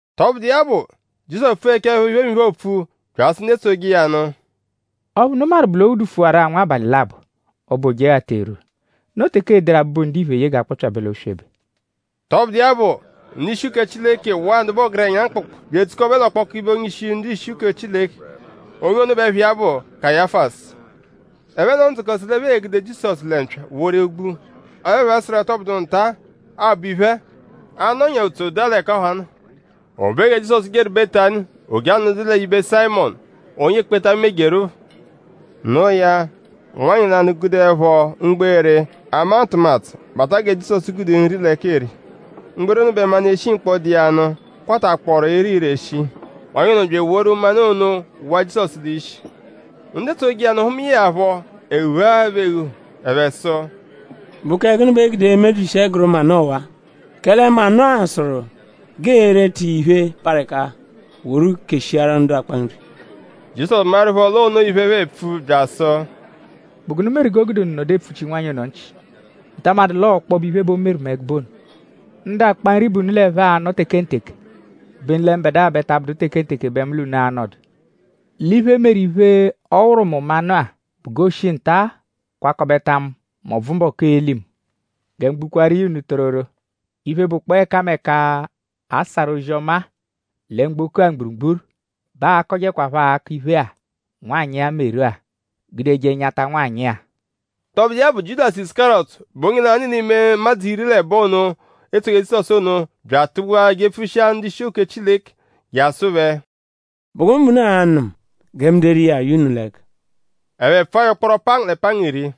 Tọbudu iya bụ; Jizọsu pfughechaẹpho iphemiphe, oopfu; bya asụ ndu etsoje iya nụ: “Ọphu unu maru bụ l'o ghudufụwaru-a abalị labọ; ọbo Ojeghata erwua. Noo teke ee-deru Abụbu-Ndiphe ye g'a kpọpyabe l'oswebe.” Tọbudu iya bụ; ndu-ishi uke Chileke waa ndu bụ ọgerenya mkpụkpu bya edzukọbe l'ọkpoku ibe onye-ishi ndu-ishi uke Chileke. Onye ono bẹ ẹpha iya bụ Kayafasu. Ẹphe nọo ndzukọ sụ l'ẹphe e-gude Jizọsu lẹ mpya woru gbua. Ọle ẹphe sụru l'ọ tọ bụduru nta-a, aabọ iphe-a; a -nọnyaa ùtsú daa l'ẹka ọha nọ. O be gẹ Jizọsu jeru Betani; o je anọdu l'ibe Sayịmonu, onye ekpenta mejeru phọ. Noo ya; nwanyị lanụ gudeẹpho mgbere, ama ntụmatu bata gẹ Jizọsu gude nri l'ẹka eri. Mgbere ono bẹ manụ, eshi mkpọ, dụ iya nụ kwatakpọoru ere ire shii. Nwanyị ono bya eworu manụ ono wụa Jizọsu l'ishi. Ndu etsoje iya nụ hụmae ya phọ; ẹhu ghuahaa phẹ eghu. Ẹphe sụ: “?Bụ kẹ gụnu bẹ e gude emebyishi ẹguru manụ ọwa-a? Kẹle manụ-a sụru g'ee-reta iya iphe, parụ ẹka woru keshiaru ndu akpa nri.” Jizọsu maẹrupho l'onoo iphe, ẹphe epfu bya asụ: “?Bụ gụnu meru g'o gude unu nọdu epfuchi nwanyị ono nchị??Unu ta amadụ l'ọo ọkpobe iphe bẹ o meru mu ẹgube ono? Ndu akpa nri bẹ unu l'ẹphe anọ tekenteke; obenu lẹ mbẹdua ta abụdu tekenteke bẹ mu l'unu a-nọdu. L'iphe, meru iphe, ọ wụru mu manụ-a bụ g'o shi nta-a kwakọbeta mu m'ọbvu mbọku, ee-li mu. Gẹ mu gbukwaaru iya unu tororo; iphe, bụkpoo ẹkameka, a sarụ ozi-ọma-a lẹ mgboko-a mgburugburu bẹ aa-kọjeekwapho akọ iphe-a, nwanyị-a meru-a; gudeje nyata nwanyị-a.” Tọbudu iya bụ; Jiudasu Isukariyọtu, bụ onye lanụ l'ime ụmadzu iri l'ẹbo ono, etsoje Jizọsu ono bya atụgbua jepfushia ndu-ishi uke Chileke; je asụ phẹ: “?Bụ gụnu bẹ unu a-nụ mu gẹ mu deru iya ye unu l'ẹka?” Ẹphe pfụa ya ụkporo pangu lẹ pangu iri.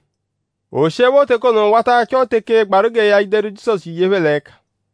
O shiẹpho teke ono wata achọ teke gbaru gẹ ya deru Jizọsu ye phẹ l'ẹka.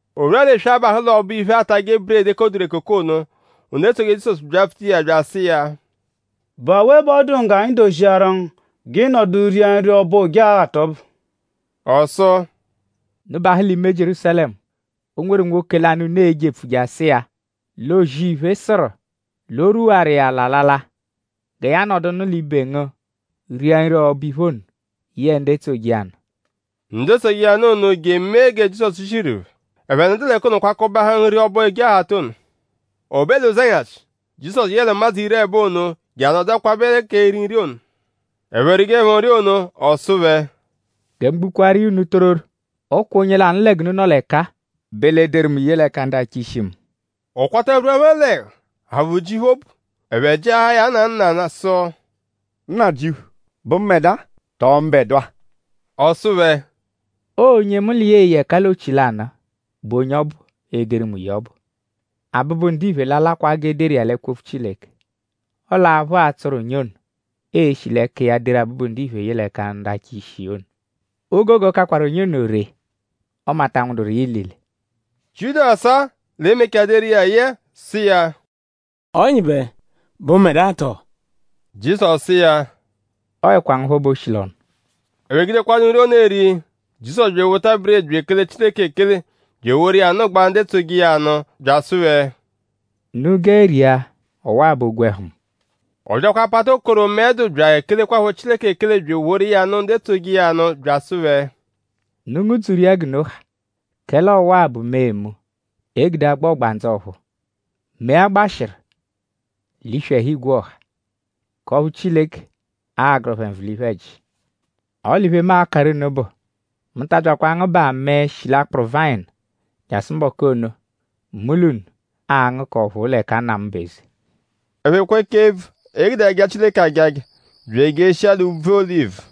O rwua l'eswe, abahụ l'ọbo-iphe, aatajẹ buredi, ekoduru ekoko ono; ndu etsoje Jizọsu byapfuta iya bya asụ iya: “?Bụ awe bẹ ọ dụ ngu g'anyi doziaru ngu g'ị nọdu ria nri ọbo Ojeghata ọbu?” Ọ sụ: “Unu bahụ l'ime Jierúsalẹmu. O nweru nwoke lanụ, unu e-jepfu je asụ iya lẹ O-zì-iphe sụru; l'o rwuwaru iya l'alala. Gẹ ya nọdunu l'ibe ngu ria nri ọbo-iphe ono yẹe ndu etsoje iya nụ.” Ndu etsoje iya nụ ono je emee gẹ Jizọsu ziru phẹ. Ẹphe nọdu l'ẹka ono kwakọbeahaa nri ọbo Ojeghata ono. O be l'ụzenyashi; Jizọsu yẹle ụmadzu iri l'ẹbo ono je anọdu kwabẹ k'eri nri ono. Ẹphe rijeẹpho nri ono; ọ sụ phẹ: “Gẹ mu gbukwaaru iya unu tororo; ọ kwa onye lanụ lẹ g'unu nọ l'ẹka-a bẹ l'e-deru mu ye l'ẹka ndu achọ ishi mu.” Ọ kwata rwua phẹ l'ẹhu; aphụ ji phẹ obu. Ẹphe jịahaa ya nanụ nanụ sụ: “Nnajịuphu;?bụ mbẹdua tọo mbẹdua?” Ọ sụ phẹ: “Ọo onye mu l'iya eye ẹka l'ochi lanụ-a bụ onye ọbu, e-deru mu ye ọbu. Abụbu-Ndiphe l'a-lakwa g'e deru iya l'ẹkwo-opfu Chileke. Ọle aphụ a-tsọru onye ono, ee-shi l'ẹka iya deru Abụbu-Ndiphe ye l'ẹka ndu achọ ishi iya ono. O gogo kakwaru onye ono ree ọme a ta nwụduru iya ilile.” Jiudasu-a, l'e-mechaa deru iya ye-a sụ iya: “Ọnyibe;?bụ mbẹdua tọo?” Jizọsu sụ iya: “Ọoekwa ngu phọ bẹ o shi l'ọnu.” Ẹphe gudekwadụ nri ono eri; Jizọsu bya ewota buredi bya ekele Chileke ekele; bya eworu iya nụgbaa ndu etsoje iya nụ; bya asụ phẹ: “Unu gẹe ria. Ọwa-a bụ ogwẹhu mu.” Ọ byakwa apata okoro, mẹe dụ bya ekelekwaphọ Chileke ekele bya eworu iya nụ ndu etsoje iya nụ bya asụ phẹ: “Unu ngụ-dzuru iya g'unu ha. Kẹle ọwa-a bụ mee mu, egude agba ọgbandzu ọ̀phúú; mee a gbashịru l'iswi ẹhu igwe ọha; k'ọphu Chileke a-gụru phẹ nvụ l'iphe-ẹji. Ọle iphe, mu a-karụ unu bụ; mu ta abyakwa angụbaa mẹe, shi l'akpụru vayịnu jasụru mbọku ono, mu l'unu a-ngụ k'ọ̀phúú l'ẹka Nna mu bụ eze.” Ẹphe kwechaa ebvu, e gude aja Chileke ajaja; bya ejeshia l'úbvú Olivu.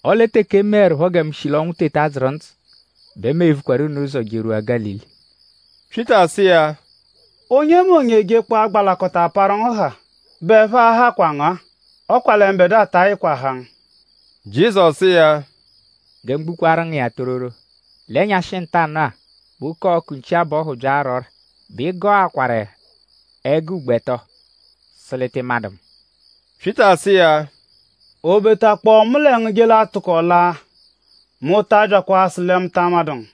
Ọle teke e meẹrupho gẹ mu shi l'ọnwu teta dzụru ndzụ bẹ mu e-vukwaru unu ụzo jerwua Gálili.” Pyịta sụ iya: “Onyemonye -jekpọo agbalakọta parụ ngu haa bẹ ẹphe a-hakwa ngu-a; ọ kwa lẹ mbẹdua ta ayịkwa haa ngu.” Jizọsu sụ iya: “Gẹ mu gbukwaaru ngu iya tororo; l'ẹnyashi ntanụ-a bẹ oke-ọku nchi-abọhu -bya ara ọ́rà; bẹ ị gọakwaru ẹgo ugbo ẹto sụ l'ị tị madụ mu.” Pyịta sụ iya: “O betakpọo mu lẹ ngu je a-tụko laa; mu ta abyakwa asụ lẹ mu ta amadụ ngu.”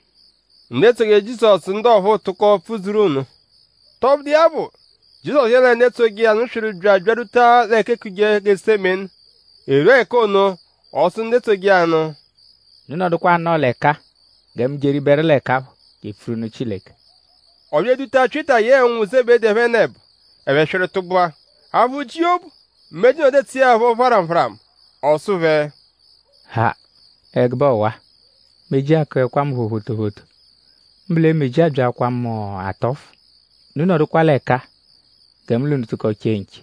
Ndu etsoje Jizọsu ndu ọphuu tụko pfudzuru nno. Tọbudu iya bụ; Jizọsu yẹle ndu etsoje iya nụ swịru bya abyarwuta l'ẹka eekuje Getusemeni. E rwua ẹka ono; ọ sụ ndu etsoje iya nụ: “Unu nọdukwa anọo l'ẹka-a gẹ mu jeribẹru l'ẹka phọ je epfuru nụ Chileke.” Ọ bya eduta Pyịta yẹe ụnwu Zebedi ẹphenebo; ẹphe swịru tụgbua. Aphụ ji iya obu; meji nọdu etsuẹ ya phọ pharamu pharamu. Ọ sụ phẹ: “Ha; ẹgube ọwa! Meji akụekwa mu phọ photophoto; mbụ lẹ meji abyaakwaa mu atọfu. Unu nọdukwa l'ẹka-a gẹ mu l'unu tụko chee nche.”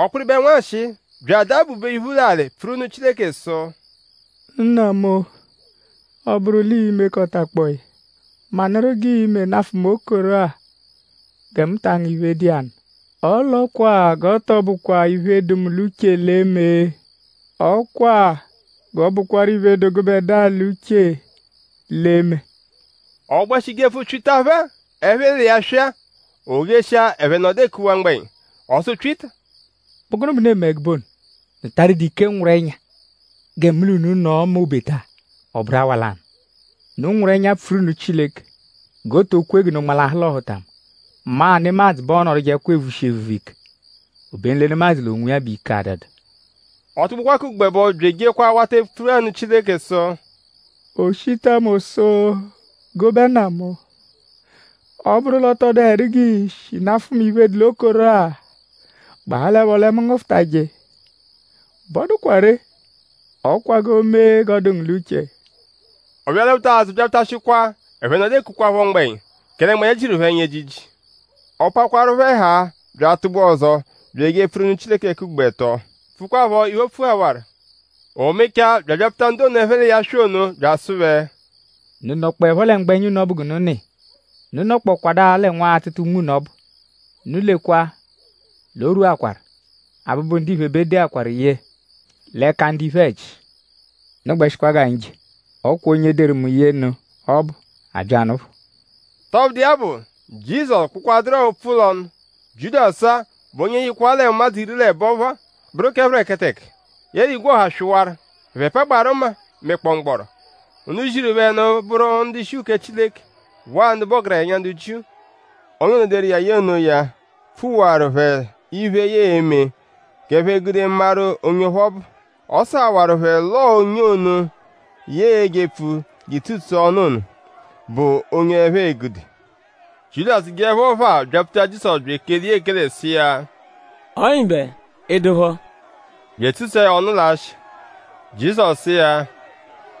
Ọ kpịriberu nwanshịi; bya adaa bube iphu l'alị pfuru nụ Chileke sụ: “Nna mu; ọ -bụru l'ii-mekọtakpoo ya; manụru g'ii-me nafụ mu okoro-a gẹ mu ta angụ iphe, dụ iya nụ. Ọle ọ kwa g'ọ tọ bụkwa iphe, dụ mu l'uche l'e-me. Ọ kwa g'ọ bụkwaru iphe, dụ gụbedua l'uche l'e-me.” Ọ gbẹshi jepfu Pyịta phẹ-a, ẹphe l'iya swị-a. O jeshia; ẹphe nọdu ekuwaa mgbẹnya. Ọ sụ Pyịta: “?Bụ gụnu bẹ unu eme ẹgube ono??Unu ta adụdu ike nwụru ẹnya gẹ mu l'unu nọo m'obeta ọ bụru awa lanụ? Unu nwụru ẹnya; pfuru nụ Chileke g'o to kwe g'unu nmalahụ l'ọhutama. Maa nemadzụ bẹ ọ nọdujekpokwa evushi evuvu ike; obenu lẹ nemadzụ l'onwiya bẹ ike adụdu.” Ọ tụgbukwaa k'ugbo ẹbo bya ejekwa awata epfu anụ Chileke sụ: “O shita mu sụ gụbe Nna mu; ọ -bụru l'ọ tọ dụhedu g'ii-shi nafụ mu iphe, dụ l'okoro-a; gbahalẹpho lẹ mu ngụfutaje iya bẹ ọ dụkwaa ree; ọ kwa g'o mee g'ọ dụ ngu l'uche.” Ọ bya alwaphutakwa azụ byatashịkwa; ẹphe nọdu ekukwaphọ mgbẹnya; kẹle mgbẹnya jiru phẹ ẹnya ejiji. Ọ pakwarụ phẹ haa bya atụgbua ọzo bya eje epfuru nụ Chileke k'ugbo ẹto; pfukwaaphọ iphe, o pfuhawaru. O mechaa; bya abyapfuta ndu ono, ẹphe l'iya swị ono; bya asụ phẹ: “?Unu nọkpoepho lẹ mgbẹnya g'unu nọ iya??Unu nọkpokwadua lẹ nwa atụta unme unu ọbu? Unu lekwa l'o rwuakwaru. Abụbu-Ndiphe bẹ e deakwaru ye l'ẹka ndu iphe-ẹji. Unu gbẹshikwa g'anyi je. Ọ kwa onye deru mu ye nụ ọbu abya nụ phọ.” Tọbudu iya bụ; Jizọsu kpụkwaduru-a opfu l'ọnu; Jiudasu-a, bụ onye yịkwaa l'ụmadzu iri l'ẹbo phọ-a bụru phẹreketeke; yẹle igwe ọha swịwaru. Ẹphe pagbaarụ mma mẹkpoo mgbọro. Ndu ziru phẹ nụ bụru ndu-ishi uke Chileke waa ndu bụ ọgerenya ndu Jiu. Onye ono, deru iya ye onoya pfuwaru phẹ iphe, ya e-me g'ẹphe gude maru onye ọphu ọ bụ. Ọ sụhawaru phẹ l'ọo onye ono, ya e-jepfu je etsutsua ọnu ono bụ onye ẹphe e-gude. Jiudasu jeẹpho phaa byapfuta Jizọsu bya ekele iya ekele sụ iya: “Ọnyibe!?Ị dụpho?” bya etsutsua ya ọnu l'asha. Jizọsu sụ iya: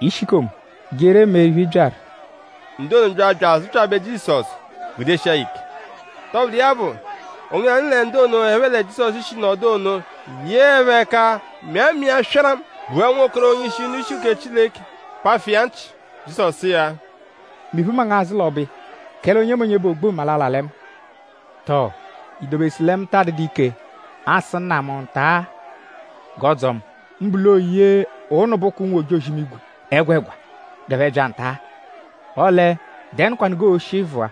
“Ishikomu; jerọ emee iphe, ị byaru.” Ndu ono bya bya azụpyabe Jizọsu; gudeshia ya ike. Tọbudu iya bụ; onye lanụ lẹ ndu ono, ẹphe lẹ Jizọsu shi nọdu ono yeẹpho ẹka mịa mma iya swaramụ; gbua nwokoro onye-ishi ndu-ishi uke Chileke; pafụ iya nchị. Jizọsu sụ iya: “Mị-phu mma ngu azụ l'ọbo iya; kẹle onyemonye, bụ o-gbu-mma l'a-la lẹ mma. Tọo?i dobesụ lẹ mu taa dụdu ike asụ Nna mu nta-a g'ọ dzọo mu; mbụ l'oo ye ụnubuku ụnwu-ojozi-imigwe ẹgwegwa g'ẹphe bya nta-a? Ọle;?dẹnukwanu g'oo-shi vụa;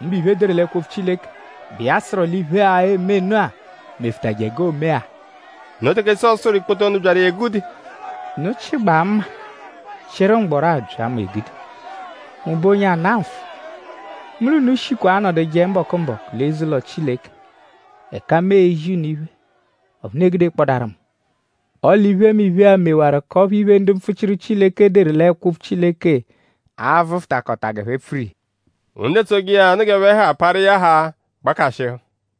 mbụ iphe, e deru l'ẹkwo-opfu Chileke, bụ iya sụru l'iphe-a, eme nụ-a mefụtaje g'oome-a?” Noo teke Jizọsu sụru ikpoto ndu byaru iya egude: “?Unu chịgbaa mma; chịru mgbọro abya mu egude??Mu bụ onye ana nfụ? Mu l'unu shikwa anọduje mbọku-mbọku l'eze-ụlo Chileke; ẹka mu ezi unu iphe; ọphu unu egudekpọdaaru mu. Ọle iphemiphe-a mewaru k'ọphu iphe, ndu mpfuchiru Chileke deru l'ẹkwo-opfu Chileke aa-vụfutakota g'ẹphe pfuru iya.” Ndu etsoje iya nụ g'ẹphe ha parụ iya haa; gbakashịhu.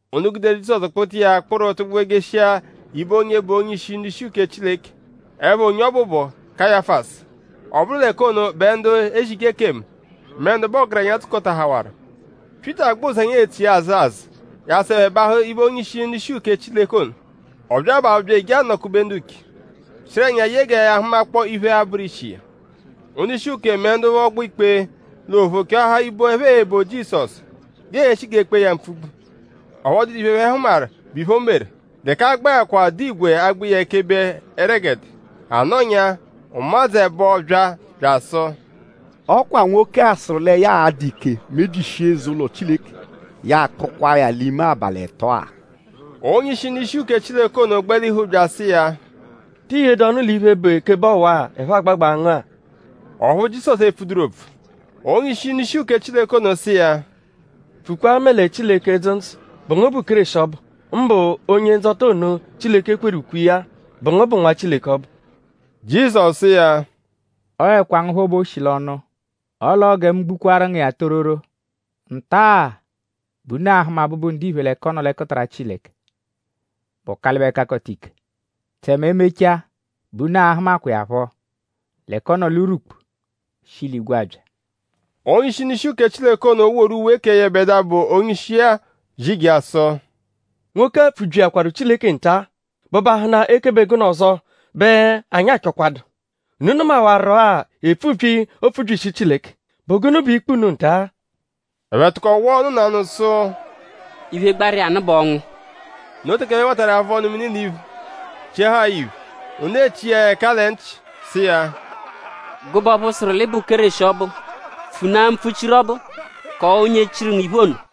Ndu guderu Jizọsu kpụta iya kpụru tụgbua jeshia ibe onye bụ onye-ishi ndu-ishi uke Chileke. Ẹpha onye ono bụ Kayafasu. Ọ bụru l'ẹka ono bẹ ndu ezije ekemu mẹ ndu bụ ọgerenya dzukọtahawaru. Pyịta gbẹ ụzenya etso iya azụ azụ jasụ ẹphe bahụ ibe onye-ishi ndu-ishi uke Chileke ono. Ọ bya abahụ bya eje anọ-kube ndu nche; chịru ẹnya ye gẹ ya hụmakpoo iphe, a-bụru ishi iya. Ndu-ishi uke Chileke mẹ ndu ọgbo-ikpe l'ophu chọahaa ibo, ẹphe e-bo Jizọsu; g'ee-shi g'ee-kpee ya mpfugbu. Ọphu ọ dụdu iphe, ẹphe hụmaru, bụ iphe, o meru; l'ẹka a gbẹkwa dụ igwe agba iya ekebe ẹregede. A nọnyaa; ụmadzu ẹbo bya bya asụ: “Ọ kwa nwoke-a sụru lẹ ya a-dụ ike mebyishia eze-ụlo Chileke; ya akpụkwaa ya l'ime abalị ẹto-a.” Onye-ishi ndu-ishi uke Chileke ono gbalihu bya asụ iya: “?Ti yedu ọnu l'iphe, bụ ekebe ọwa-a, ẹphe agbagbaa ngu-a?” Ọphu Jizọsu epfuduru opfu. Onye-ishi ndu-ishi uke Chileke ono sụ iya: “Pfukwaa mẹle Chileke, dzụ ndzụ.?Bụ ngu bụ Kéreshi ọbu? Mbụ Onye-Ndzọta ono, Chileke kweru ukwe iya-a.?Bụ ngu bụ Nwa Chileke ọbu?” Jizọsu sụ iya: “Ọoekwa ngu phọ bẹ o shi l'ọnu. Ọ l'ọo gẹ mu gbukwaaru iya unu tororo; nta-a bẹ unu a-hụma Abụbu-Ndiphe l'ẹka ọ nọ l'ẹkutara Chileke, bụ Ọkalibe-Kakọta-Ike. Tẹme e -mechaa bẹ unu a-hụmakwa iya phọ l'ẹka ọ nọ l'urwukpu shi l'igwe abya.” Onye-ishi ndu-ishi uke Chileke ono woru uwe kẹ yẹbedua bụ onye-ishi-a zijaa sụ: “Nwoke-a pfubyiakwaru Chileke nta-a.?Bụbahunaa ekebe gụnu ọzo bẹ anyi achọkwadu? Unu nụmawaru-a epfubyi, oopfubyishi Chileke. ?Bụ gụnu bụ ikpe unu nta-a?” Ẹphe tụko wụa ọnu nanụ sụ: “Iphe, gbaru iya nụ bụ ọnwu!” Noo teke ẹphe watarụ iya avụ ọnu-mini l'iphu; chiahaa ya iphe; ndu echi iya ẹka lẹ nchị sụ iya: “Gụbe ọphu sụru l'ị bụ Kéreshi ọbu; pfunaa mpfuchiru ọbu; kọo onye chiru ngu iphe ono.”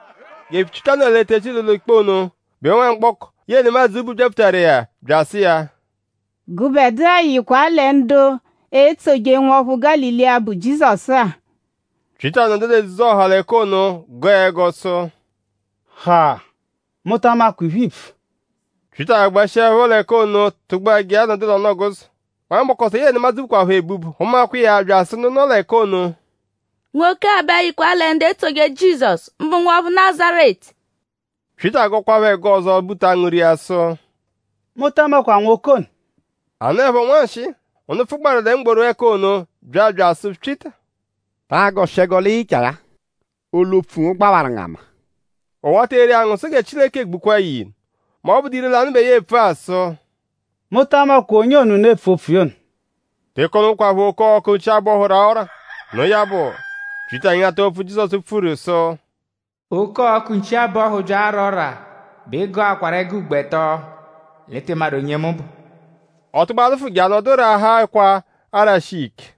Gẹ Pyịta nọ l'etezi l'ụlo-ikpe ono; bẹ nwamgbọko, yẹe nemadzụ bu byapfutaru iya bya asụ iya: “Gụbedua yịkwa-a lẹ ndu etsoje nwọphu Gálili-a, bụ Jizọsu-a.” Pyịta nọdu l'edzudzu-ọha l'ẹka ono gọo ẹgo sụ: “Ha! Mu ta amakwa iphe, iipfu.” Pyịta gbẹshiepho l'ẹka ono tụgbua je anọdu l'ọnu-ọguzo. Nwamgbọko ọzo, yẹe nemadzụ bukwaphọ ebubu hụmakwa iya bya asụ ndu nọ l'ẹka ono: “Nwoke-a bẹ yịkwa lẹ ndu etsoje Jizọsu; mbụ nwọphu Nazaretu.” Pyịta gọkwaapho ẹgo ọzo buta angụ ria sụ: “Mu ta amakwa nwoke ono.” A nọepho nwanshịi; ndu pfụgbaaru lẹ mgboru ẹka ono bya bya asụ Pyịta: “Ta agọshi ẹgo l'ị yịchaa ya-a; olu-opfu ngu gbawaru ngu ama.” Ọ wata eri angụ sụ gẹ Chileke gbukwaa ya ilu mẹ ọ -bụdu ire-lanụ bẹ ya epfu-a. Sụ: “Mu ta amakwa onye ono, unu epfu opfu iya ono.” Teke onokwaphọ oke-ọku nchi-abọhu raa ọ́rà. Noo ya bụ; Pyịta nyata opfu, Jizọsu pfuru sụ: “Oke-ọku nchi-abọhu -bya ara ọ́rà; bẹ ị gọakwaru ẹgo ugbo ẹto l'ị tị madụ onye mu bụ.” Ọ tụgbua lụfu je anọdu raahaa ẹkwa arashi iya ike.